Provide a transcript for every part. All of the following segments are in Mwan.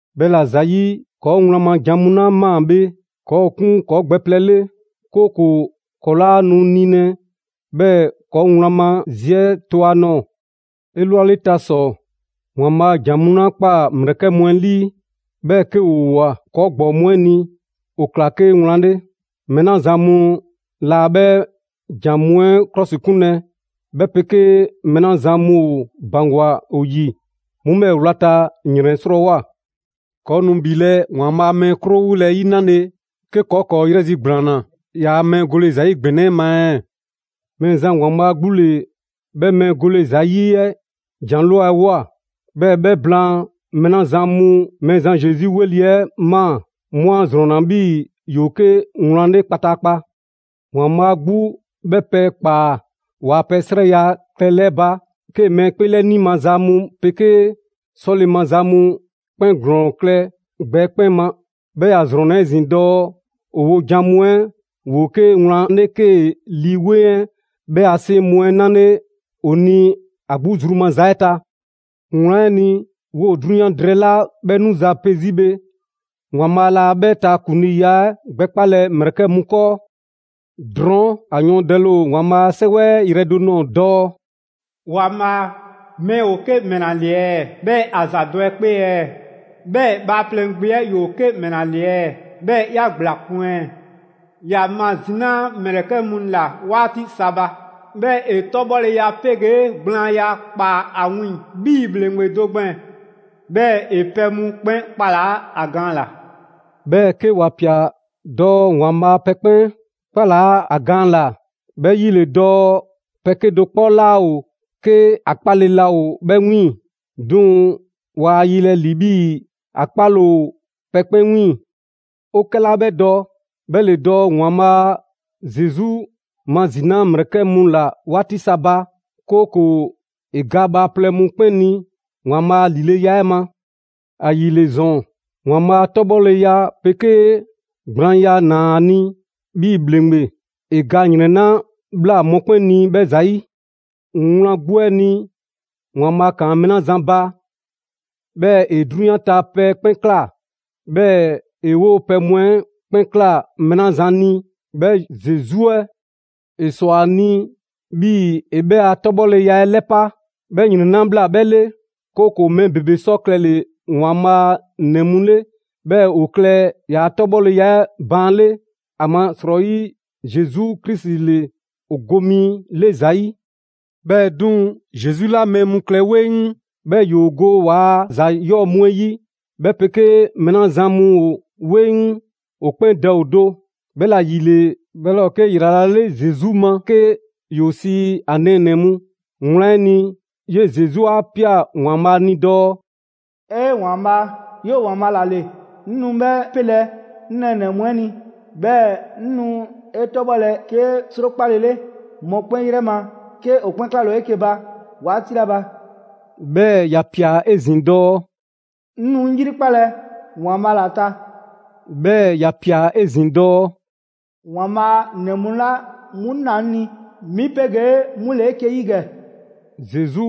'Bhɛla‑ ‑zayi', ‑kɔɔ' wlan ma jan mu 'la 'maa‑ bhe, ‑kɔɔ' ‑o 'kun ‑kɔɔ' gbɛ plɛ 'le; 'kooko‑ ‑kɔɔ' 'laa nu nilɛ, 'bhɛɛ‑ ‑kɔɔ' wlan ma zi 'ɛ to ‑a nɔɔ‑. 'Elwaleta ‑sɔ, ‑Waanbhaa' ‑jan mu 'la ꞊kpaa ‑mlɛkɛ' mu 'ɛ ‑lii, 'bhɛɛ‑ 'ke ‑woo ꞊woa ‑kɔɔ' ‑gbɔɔ mu 'ɛ ni, ‑o ‑kla 'ke wlan 'le. Mɛɛ 'la zan mu laa 'bhɛ ‑jan mu 'ɛ 'klɔsikunlɛ, 'bhɛ 'pegee mɛɛ 'la zan mu ‑o ‑baŋgwa ‑o ‑yi, 'mu 'bhɛɛ‑ wlata ‑yrɛn 'srɔɔwoa‑. ‑Kɔɔ' nu ‑bhilɛ' ‑Waanbhaa' a mɛɛ 'krowole 'ɛ 'yi 'nale, 'ke ‑kɔɔ' ‑kɔɔ' 'yrɛzigblaanna ‑yaa' mɛɛ gole ‑za 'yi ‑gbɛnɛ 'ɛ ma ɛɛ? Mɛɛzan ‑Waanbhaa' 'gbu ‑le 'bhɛ mɛɛ gole ‑za 'yi 'ɛ jan ꞊lwa 'ɛ ꞊woa; 'bhɛɛ‑ 'bhɛ blaan, mɛɛ 'la zan mu Mɛɛzan Zesu 'weli‑ 'ɛ ꞊maa, 'mu 'a ‑zrɔnna 'bhii‑ ‑yoo 'ke wlan 'le kpataakpa. ‑Waanbhaa' 'gbu 'bhɛ pɛ ꞊kpaa ‑waa' pɛ 'srɛya‑ klɛle 'ɛ ba 'kee‑ mɛɛ 'kpeelɛni maza mu 'pegee 'sɔle‑ maza mu 'kpɛn ‑glɔɔn klɛ gbɛ 'ɛ 'kpɛn ma. 'Bhɛɛ‑ ‑ya ‑zrɔnna 'ezin‑ dɔɔ ‑o wojan mu 'ɛ ‑woo 'ke wlan 'le 'kee‑ Lii 'Weŋ 'ɛ 'bhɛ a 'seŋ mu 'ɛ 'nale ‑o ni ‑a 'gbu zru maza 'ɛ ta. Wlan 'ɛ ni, 'woo‑ 'drunyan drɛɛ 'la 'bhɛ 'nuza‑ pe 'zi bhe, ‑Waanbhaa' laa 'bhɛ ta ‑kuŋliiya 'ɛ gbɛkpalɛ ‑mlɛkɛ' mu 'kɔɔ. Drɔɔn' ‑a yɔɔndɛle ‑o ‑Waanbhaa' a 'Sɛwɛ 'ɛ yrɛ do nɔɔ‑ dɔɔ: «‑Waanbhaa', mɛɛ ‑o 'ke ‑mɛla ‑le ɛɛ 'bhɛɛ‑ ‑a ‑za dɔ 'e 'kpee ɛɛ? 'Bhɛɛ‑ bhaaplɛŋ gbe 'ɛ ‑yoo 'ke ‑mɛla ‑le ɛɛ? 'Bhɛɛ‑ 'ya ‑gblakun' ɛɛ? 'Ya mazinaa ‑mlɛkɛ' mu ꞊la 'waati sa ba, 'bhɛɛ‑ 'e 'tɔbhɔleya 'pegee gblaanya ꞊kpaa ‑a wiiŋ‑ 'bhii‑ ‑bhleŋgbe do gbɛɛn‑. 'Bhɛɛ‑ 'e pɛ mu 'kpɛn 'kpalaa ‑a gaan ‑la.» 'Bhɛɛ‑ 'ke ‑wa ꞊pia dɔɔ ‑Waanbhaa' pɛ 'kpɛn 'kpalaa ‑a gaan ‑la, 'bhɛ 'yi 'le dɔɔ pɛ 'kedo‑ 'kpɔ 'laa ‑o 'ke ‑a 'kpaale‑ laa ‑o 'bhɛ 'wiiŋ‑. 'Duŋ‑ 'waa 'yelɛ‑ ‑li 'bhii‑ ‑a 'kpaale‑ ‑o pɛ 'kpɛn 'wiiŋ‑. 'O 'kɛla 'bhɛ dɔ 'bhɛ ‑le dɔɔ ‑Waanbhaa' Zesu mazinaa ‑mlɛkɛ' mu ‑la 'waati sa ba, 'kooko‑ ‑e ga bhaaplɛŋ mu 'kpɛn ni ‑Waanbhaa' a ‑lileya 'ɛ ma. ‑Ayile ‑zɔn, ‑Waanbhaa' 'tɔbhɔleya 'pegee gblaanya ‑naa ‑a ni 'bhii‑ ‑bhleŋgbe, ‑e ga ‑yrɛn 'la ꞊bhla mɔkpɛn' ni 'bhɛ ‑zayi'. Wlan 'gbu 'ɛ ni, ‑Waanbhaa' ‑kaan mɛɛ 'la zan ba, 'bhɛɛ‑ ‑e 'drunyan ta pɛ 'kpɛn ꞊kla, 'bhɛɛ‑ ‑e 'woo‑ pɛ mu 'ɛ 'kpɛn ꞊kla mɛɛ 'la zan ni, 'bhɛ Zesu 'ɛ; ‑e ‑swa ‑a ni 'bhii‑ ‑e 'bhɛɛ‑ a 'tɔbhɔleya 'ɛ 'lɛpa‑ 'bhɛ ‑yrɛn 'la ꞊bhla 'bhɛ 'le, 'kooko‑ mɛɛ ‑bebe sɔ klɛle‑ ‑Waanbhaa' ‑nɛ mu 'le, 'bhɛɛ‑ ‑o klɛ ‑yaa' 'tɔbhɔleya 'ɛ baan' 'le; ‑amasrɔyi Zesu Krisi ‑le ‑o go mi 'le ‑za 'yi. 'Bhɛɛ‑ 'duŋ‑, Zesu 'la mɛɛ mu klɛ 'weŋ 'bhɛɛ‑ ‑yoo go ‑waa' ‑za 'yɔɔ‑ mu 'ɛ 'yi, 'bhɛ 'pegee mɛɛ 'la zan mu ‑o 'weŋ, ‑o 'kpɛn Dɛ ‑o do. 'Bhɛla‑ ‑yile 'bhɛ 'laa ‑o 'ke ‑yrala' Zesu ma 'ke ‑yoo sii ‑a nɛɛnɛ‑ mu. Wlan 'ɛ ni, 'yee‑ Zesu 'a ꞊pia ‑Waanbhaa' ni dɔɔ: «'E ‑Waanbhaa', 'yoo‑ ‑Waanbhaa' ‑la ‑le, 'ŋ nu 'bhɛ 'pelɛ‑ 'ŋ nɛɛnɛ‑ mu 'ɛ ni, 'bhɛɛ‑ 'ŋ nu 'e 'tɔbhɔlɛ 'ke 'srokpalele mɔkpɛn' 'yrɛ ma 'ke 'o 'kpɛn 'klale‑ ‑o 'eke‑ ba 'waati 'la ba.» 'Bhɛɛ‑ ‑ya ꞊pia 'ezin‑ dɔɔ: «'Ŋ nu 'ŋ 'yrikpalɛ ‑Waanbhaa' ‑la ta.» 'Bhɛɛ‑ ‑ya ꞊pia 'ezin‑ dɔɔ: «‑Waanbhaa' ‑nɛ mu 'la mu ꞊naa 'ŋ ni 'mi 'pegee 'mu ‑le 'eke‑ 'yi ‑gɛ.» Zesu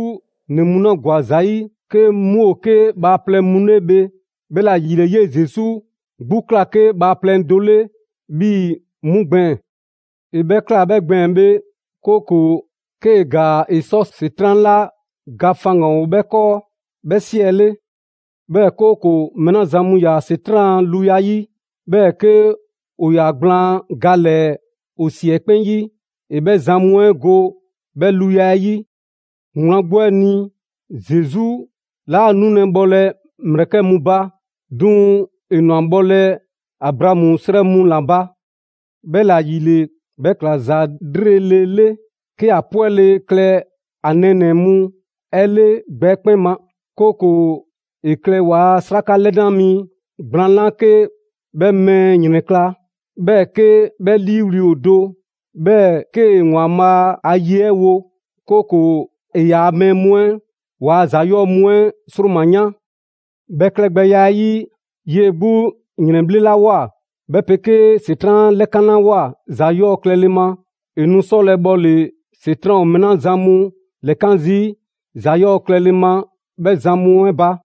‑nɛ mu 'la ‑gwa ‑za 'yi, 'ke 'mu ‑o 'ke bhaaplɛŋ mu 'le bhe, 'bhɛla‑ ‑yile 'yee‑ Zesu 'gbu ꞊kla 'ke bhaaplɛŋ do 'le 'bhii‑ 'mu gbɛɛn‑. ‑E 'bhɛ ꞊kla 'bhɛ gbɛɛn‑ bhe, 'kooko‑ 'kee‑ ‑gaa, ‑e sɔ ‑Setran' 'la ga faŋgan‑ ‑o 'bhɛ 'kɔɔ, 'bhɛ 'siɛle. 'Bhɛɛ‑ 'kooko‑ mɛɛ 'la zan mu ‑yaa ‑Setran' a luya 'yi, 'bhɛɛ‑ 'ke ‑o ‑yaa gblaan ga ‑lɛɛ ‑o ‑si 'ɛ 'kpɛn 'yi, ‑e 'bhɛ zan mu 'ɛ go 'bhɛ luya 'ɛ 'yi. Wlan 'gbu 'ɛ ni, Zesu 'laa nulɛ bhɔlɛ ‑mlɛkɛ' mu ba, 'duŋ‑ ‑e ‑nwa bhɔlɛ Abraamu 'srɛ mu ‑la ba. 'Bhɛla‑ ‑yile, 'bhɛ ꞊kla ‑za 'lrele‑ 'le 'ke ‑a 'pwɛle‑ klɛ ‑a nɛɛnɛ‑ mu 'ɛ 'le gbɛ 'ɛ 'kpɛn ma, 'kooko‑ ‑e klɛ ‑waa' 'sraka 'lɛna mi gblaan 'la 'ke 'bhɛ mɛɛ ‑yrɛnkla', 'bhɛɛ‑ 'ke 'bhɛ 'liiwli‑ ‑o do; 'bhɛɛ‑ 'kee‑ ‑Waanbhaa' a ye 'ɛ wo, 'kooko‑ ‑e ‑yaa' mɛɛ mu 'ɛ waa ‑za 'yɔɔ‑ mu 'ɛ ‑sroma 'yan. 'Bhɛ klɛgbɛya 'ɛ 'yi, 'yee‑ 'gbu ‑yrɛnbhlelawoa, 'bhɛ 'pegee ‑Setran' 'a 'lɛkanlawoa ‑za 'yɔɔ‑ klɛle ma, ‑e nu 'sɔlɛ‑ bhɔle‑ ‑Setran' ‑o mɛɛ 'la zan mu ‑lɛkan' zii' ‑za 'yɔɔ‑ klɛle ma 'bhɛ zan mu 'ɛ ba.